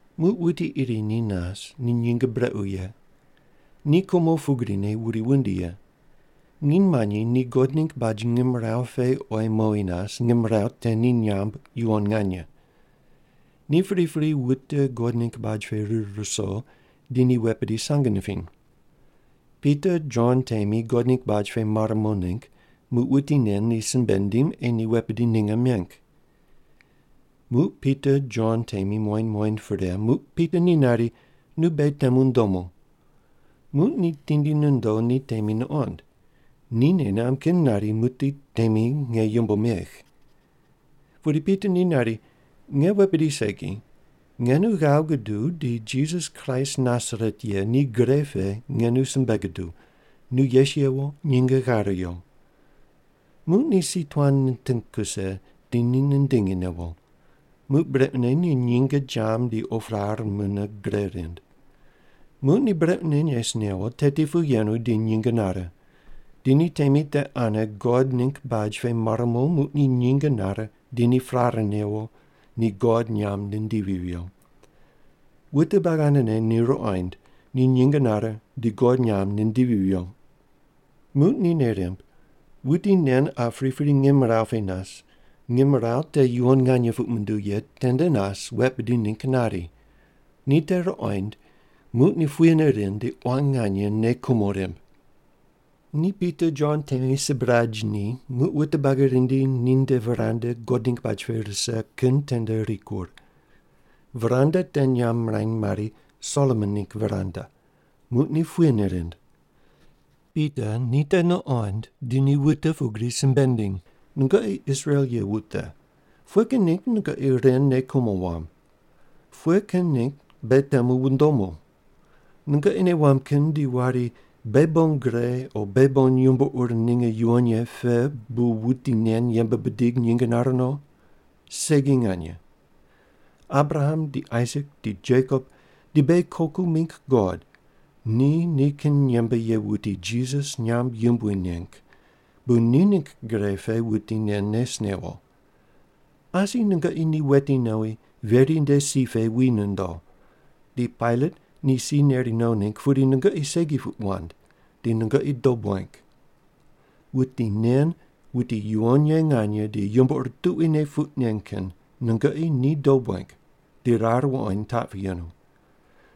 Muq wuti iri ni nas, ni nyinge brequ ye. Ni kumo pugrine wuri wundi ye. Nginy manyi ni God ningg baj ngimrawu pe ei mowi nas, ngimrawu te ni nyamb, “Yuwon nganye.” Ni pripri wute God ningg baj pe rir ruso di ni wet bidi sang nipiny. Pita Jon temi God ningg baj pe mar mo ningg, muq wuti nen ni simbe nindim ei ni wet bidi ninge meng. Muq Pita Jon temi muqoind muqoind pre, muq Pita ni nari, “Nu beghi temu ndomu.” Muq ni tindi nondo, ni temi nuqond. Ni nei namb kin nari, “Muqdi temi nge yumbo megh.” Pudi Pita ni nari, “Nge wet bidi segi. Nge nu ghav guduw, di Jisas Kraist Nasaret ye ni gre pe nge nu simbe guduw, nu yes yewo nyinge ghare yo.” Muq ni si tuan niting kuse di ni nindingi newo. Muq brequne ni nyinge jam di op rar mune gre rind. Muq ni brequne nes newo, teti pu yenu, di nyinge nare. Di ni temi te ane God ningg baj pe mar mo muq ni nyinge nare di ni prare newo, ni God nyamb nindivi viyo. Wute buagi anene ni ruqoind, ni nyinge nare di God nyamb nindivi viyo. Muq ni nei rimb, wuti nen qa pripri ngimrawu pe nas, ngimrawu te yuwon nganye puq munduw ye tende nas wet bidi ningg nari. Ni te ruqoind, muq ni puyene rind, di quan nganye nei kumo rimb. Ni Pita Jon temi sibraj ni, muq wute buagi rindi, ninde veranda God ningg baj pe rise kin tende rikur. (Veranda te nyamb mirany mari, “Solomon ningg veranda.”) Muq ni puyene rind. Pita ni te nuqond di wute pugri simbe nindiny, “Nungoqi Israel ye wute, pughe kin ningg nungoqi ren nei kumo wamb? Pughe kin ningg beghi temu wundomu? Nungoqi nei wamb kin di wari, beghi bon gre o beghi bon yumbo ur ninge yuwon ye pe bu wuti nen yembe bidig nyinge nare no. Segi nganye. Abraham di Aisak di Jekop di beghi koku mingg God ni nikin yembe ye wuti Jisas nyamb yumbui neng, bu ni ningg gre pe wuti nen nes newo. Asi nungoqi ni weti nowi, veri nde si pe wi nondo. Di Pailat ni si neri no ningg, pudi nungoqi segi puq wand. Di nungoqi dob weng. “Wuti nen wuti yuwon ye nganye di yumbo ur tuquine puq nen kin nungoqi ni dob weng, di rar wuqoind taq pu yenu.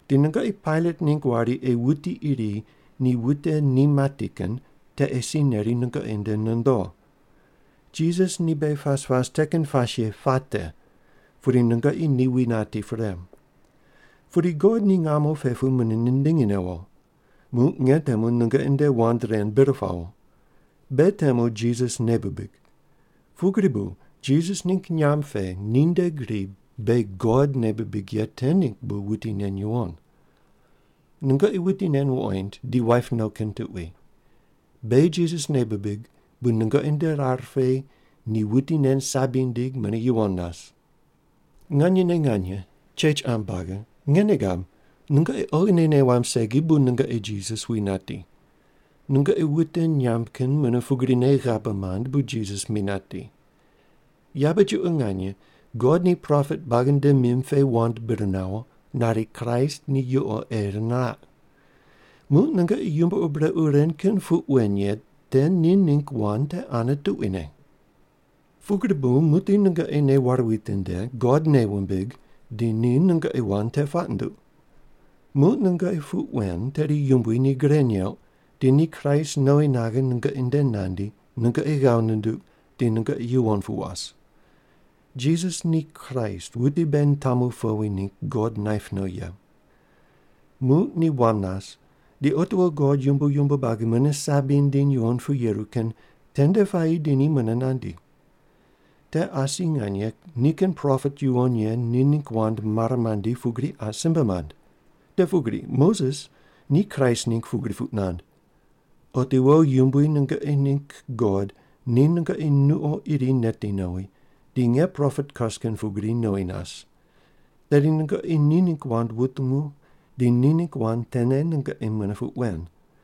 Di nungoqi Pailat ningg wari ei wuti iri ni wute ni mati kin te ei si neri nungoqi nde nondo. Jisas ni beghi pas pas te kin pas ye puate, pudi nungoqi ni wi nati pre. Pudi God ni ngamo pe pu mune nindingi newo. Muq nge temu nungoqi nde wand ren bir pawo. Beghi temu Jisas nei bibig. Pugri bu Jisas ningg nyamb pe ninde gri beghi God nei bibig ye te ningg bu wuti nen yuwon. Nungoqi wuti nen wuqoind di waip no kin tuqui. Beghi Jisas nei bibig, bu nungoqi nde rar pe ni wuti nen sabi nindig mune yuwon nas. “Nganyene nge chech qam buagi, nge nei gab, nungoqi oghine nei wamb segi bu nungoqi Jisas wi nati. Nungoqi wute nyamb kin mune pugrine ghabe mand bu Jisas mi nati. Yabe chuqo nganye God ni propet buagi nde mim pe wand bir nawo, nari Kraist ni yuqo ei niraq. Muq nungoqi yumbo ur brequ ren kin puq wen ye te ni ningg wand te ane tuquine. “Pugri bu muqdi nungoqi nei ware witinde, God nei wumbig, di ni nungoqi wand te puaq nunduq. Muq nungoqi puq wen, tedi Yumbui ni gre neuq di ni Kraist nowi naghe nungoqi nde nandi, nungoqi ghav nunduq, di nungoqi yuwon pu was. Jisas ni Kraist wuti beghi nitamu powi ningg God naip no ye. Muq ni wam nas, di otiwo God yumbo yumbo buagi mune sabi nindiny yuwon pu yeru kin tende puayi di ni mune nandi. Te asi nganye nikin propet yuwon ye ni ningg wand mare mandi pugri qa simbe mand. Te pugri Moses ni Kraist ningg pugri puq nand: ‘Otiwo Yumbui nungoqi ningg God ni nungoqi nuqo iri neti nowi, di nge propet kas kin pugri nowi nas. Tedi nungoqi ni ningg wand wutungu, di ni ningg wand tene nungoqi mune puq wen.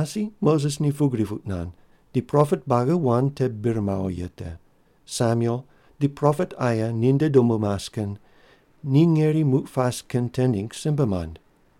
“Asi Moses ni pugri puq nand, di propet buagi wand te bir mawo ye te, Samuel di propet aye ni nde dobu mas kin, ni ngeri muq pas kin te ningg simbe mand.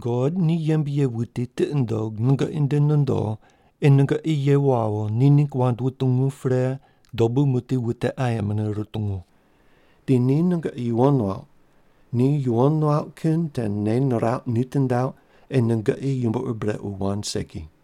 God ni yembe ye wuti tiqi nundog nungoqi nde nondo ei nungoqi ye wawo ni ningg wand wutungu pre dobu muqdi wute aye mune rutungu. Di ni nungoqi yuwon nuauq, ni yuwon nuauq kin te nei nirauq nitindauq ei nungoqi yumbo ur brequ wand segi.”